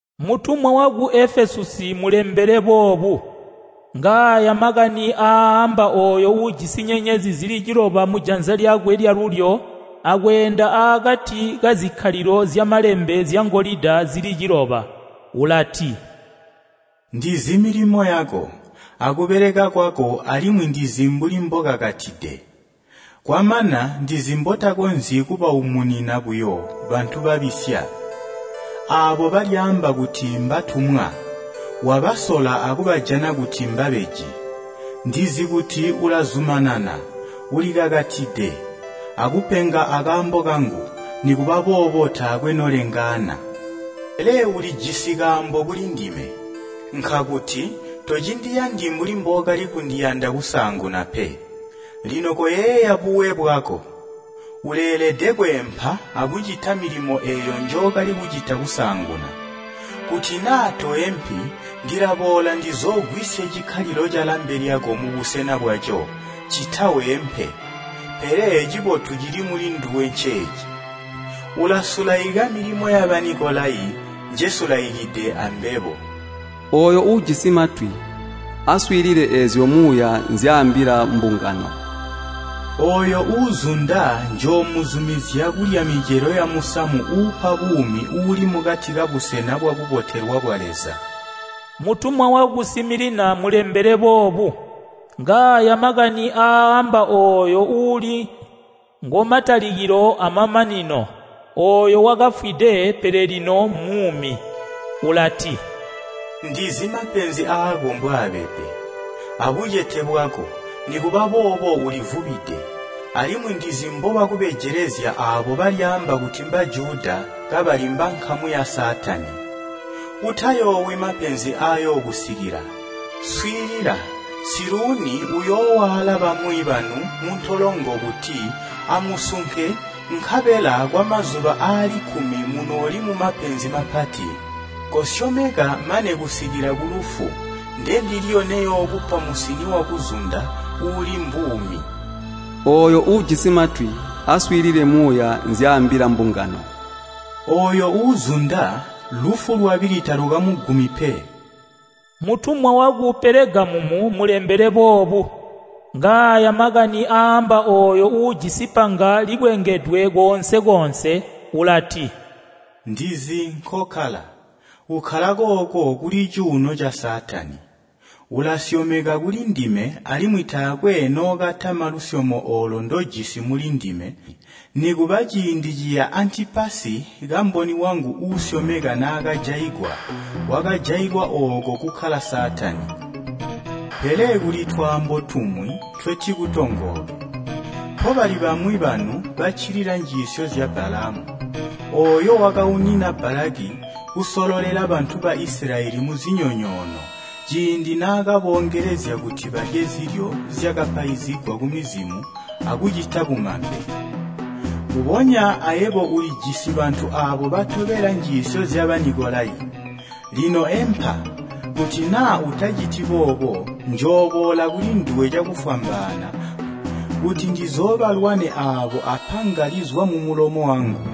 “Mutumwa waku Efesusi mulembele boobu: “Ngaaya makani aaamba ooyo uujisi nyenyezi zili ciloba mujanza lyakwe lyalulyo akweenda aakati kazikkalilo zyamalambe zyangolida zili ciloba. Ulati, ndizi milimo yako, akubeleka kwako alimwi ndizi mbuli mbokakatide. Kwamana ndizi mbotakonzyi kubaumunina buyo bantu babisya. Aabo balyaamba kuti mbatumwa, wabasola akubajana kuti mbabeji. Ndizi kuti ulazumanana, ulikakatide, akupenga akaambo kangu, nikuba boobo taakwe nolengaana. Pele ulijisi kaambo kulindime, nkakuti, tocindiyandi mbuli mbookali kundiyanda kusaanguna pe. Lino koyeeya buwe bwako! Uleelede kweempa akucita milimo eeyo njookali kucita kusaanguna. Kuti naa toempi, ndilaboola ndizoogwisye cikkalilo calambe lyako mubusena bwaco, ccita weempe. Pele cibotu cili mulinduwe nceeci: ulasulaika milimo ya Banikolayi, njesulaikide ambebo. “Ooyo uujisi matwi, aswiilile eezyo Muuya nzyaambila mbungano! “Ooyo uuzunda njoomuzumizya kulya micelo yamusamu uupa buumi uuli mukati kabusena bwakubotelwa bwa Leza. “Mutumwa waku Similina mulembele boobu: “Ngaaya makani aaamba ooyo uuli ngo matalikilo amamanino, ooyo wakafwide pele lino mmuumi. Ulati, ndizi mapenzi aako mbwaabede, abucete bwako, nikuba boobo ulivubide. Alimwi ndizi mbobakubejelezya aabo balyaamba kuti Mbajuda kabali mbankamu ya Saatani. Utayoowi mapenzi aayookusikila. Swiilila! Siluuni uyoowaala bamwi banu muntolongo kuti amusunke nkabela kwamazuba aali kkumi munooli mumapenzi mapati. Kosyomeka mane kusikila kulufu, ndendilyo neyookupa musini wakuzunda, uuli mbuumi. “Ooyo uujisi matwi, aswiilile Muuya nzyaambila mbungano! “Ooyo uuzunda, lufu lwabili talukamugumi pe. “Mutumwa waku Pelegamumu mulembele boobu: “Ngaaya makani aaamba ooyo uujisi panga likwengedwe koonse-koonse. Ulati, ndizi nkokkala, ukkala kooko kuli cuuno ca Saatani. Ulasyomeka kulindime alimwi taakwe nookatama lusyomo oolo ndojisi mulindime nikuba ciindi ciya Antipasi kamboni wangu uusyomeka naakajaigwa, wakajailwa ooko kukkala Saatani. Pele kuli twaambo tumwi ntwetikutongooke. Mpobali bamwi banu baccilila njiisyo zya Balaamu, ooyo wakaunina Balaki kusololela bantu ba Isilayeli muzinyonyoono ciindi naakaboongelezya kuti balye zilyo zyakapaizigwa kumizimo akucita bumambe. Mbubonya ayebo ulijisi bantu aabo batobela njiisyo zya Banikolayi. Lino empa, kuti naa utaciti boobo, njooboola kulinduwe cakufwambaana kuti ndizoobalwane aabo apanga lizwa mumulomo wangu.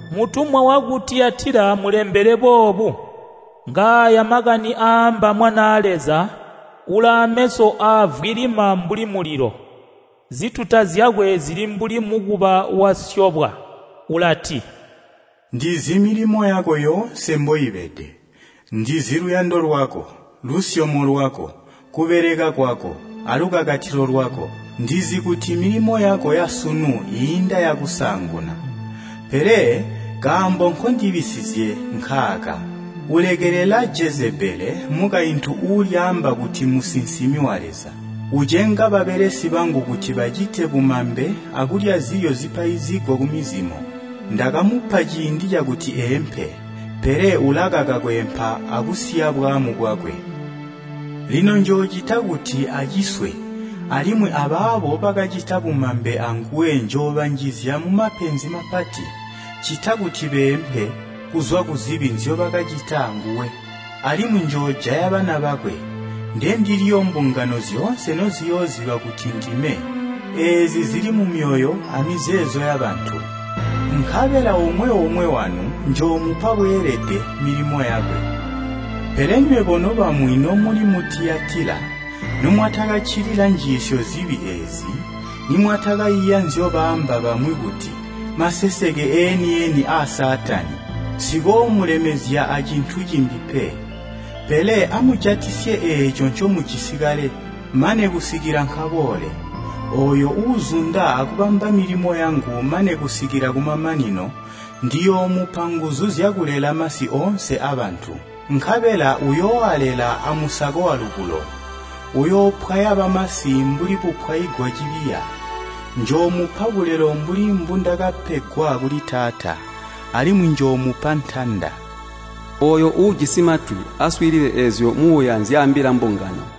“Mutumwa waku Tiyatila mulembele boobu: “Ngaaya makani aaamba Mwanaa Leza uulaameso aavwilima mbuli mulilo, zituta zyakwe zili mbuli mukuba wasyobwa. Ulati, ndizi milimo yako yoonse mboibede. Ndizi luyando lwako, lusyomo lwako, kubeleka kwako, alukakatilo lwako. Ndizi kuti milimo yako yasunu iinda yakusaanguna. Pele kaambo nkondibisizizye nkaaka: Ulekelela Jezebele mukaintu uulyaamba kuti mmusinsimi wa Leza. Ucenga babelesi bangu kuti bacite bumambe akulya zilyo zipaizigwa kumizimo. Ndakamupa ciindi cakuti eempe, pele ulakaka kweempa akusiya bwaamu bwakwe. Lino njoocita kuti aciswe alimwi abaabo bakacita bumambe anguwe njoobanjizya mumapenzi mapati, ccita kuti beempe kuzwa kuzibi nzyobakacita anguwe. Alimwi njoojaya bana bakwe. Ndendilyo mbungano zyoonse noziyooziba kuti ndime eezi zili mumyoyo amizeezo yabantu. Nkabela omwe-omwe wanu njoomupa bweelede milimo yakwe. “Pele nywebo nobamwi nomuli mu Tiyatila, nomwatakaccilila njiisyo zibi eezi, nimwatakaiya nzyobaamba bamwi kuti, ‘Maseseke eeni-eni aa Saatani,’ nsikoomulemezya acintu cimbi pe. Pele amujatisye eeco ncomujisi kale, mane kusikila nkaboole. Ooyo uuzunda akubamba milimo yangu mane kusikila kumamanino, ndiyoomupa nguzu zyakulela masi oonse abantu. Nkabela uyooalela amusako walubulo. Uyoopwaya bamasi mbuli bupwaigwa cibiya. Njoomupa bulelo mbuli mbundakapegwa kuli Taata. Alimwi njoomupa ntanda. “Ooyo uujisi matwi, aswiilile eezyo Muuya nzyaambila mbungano!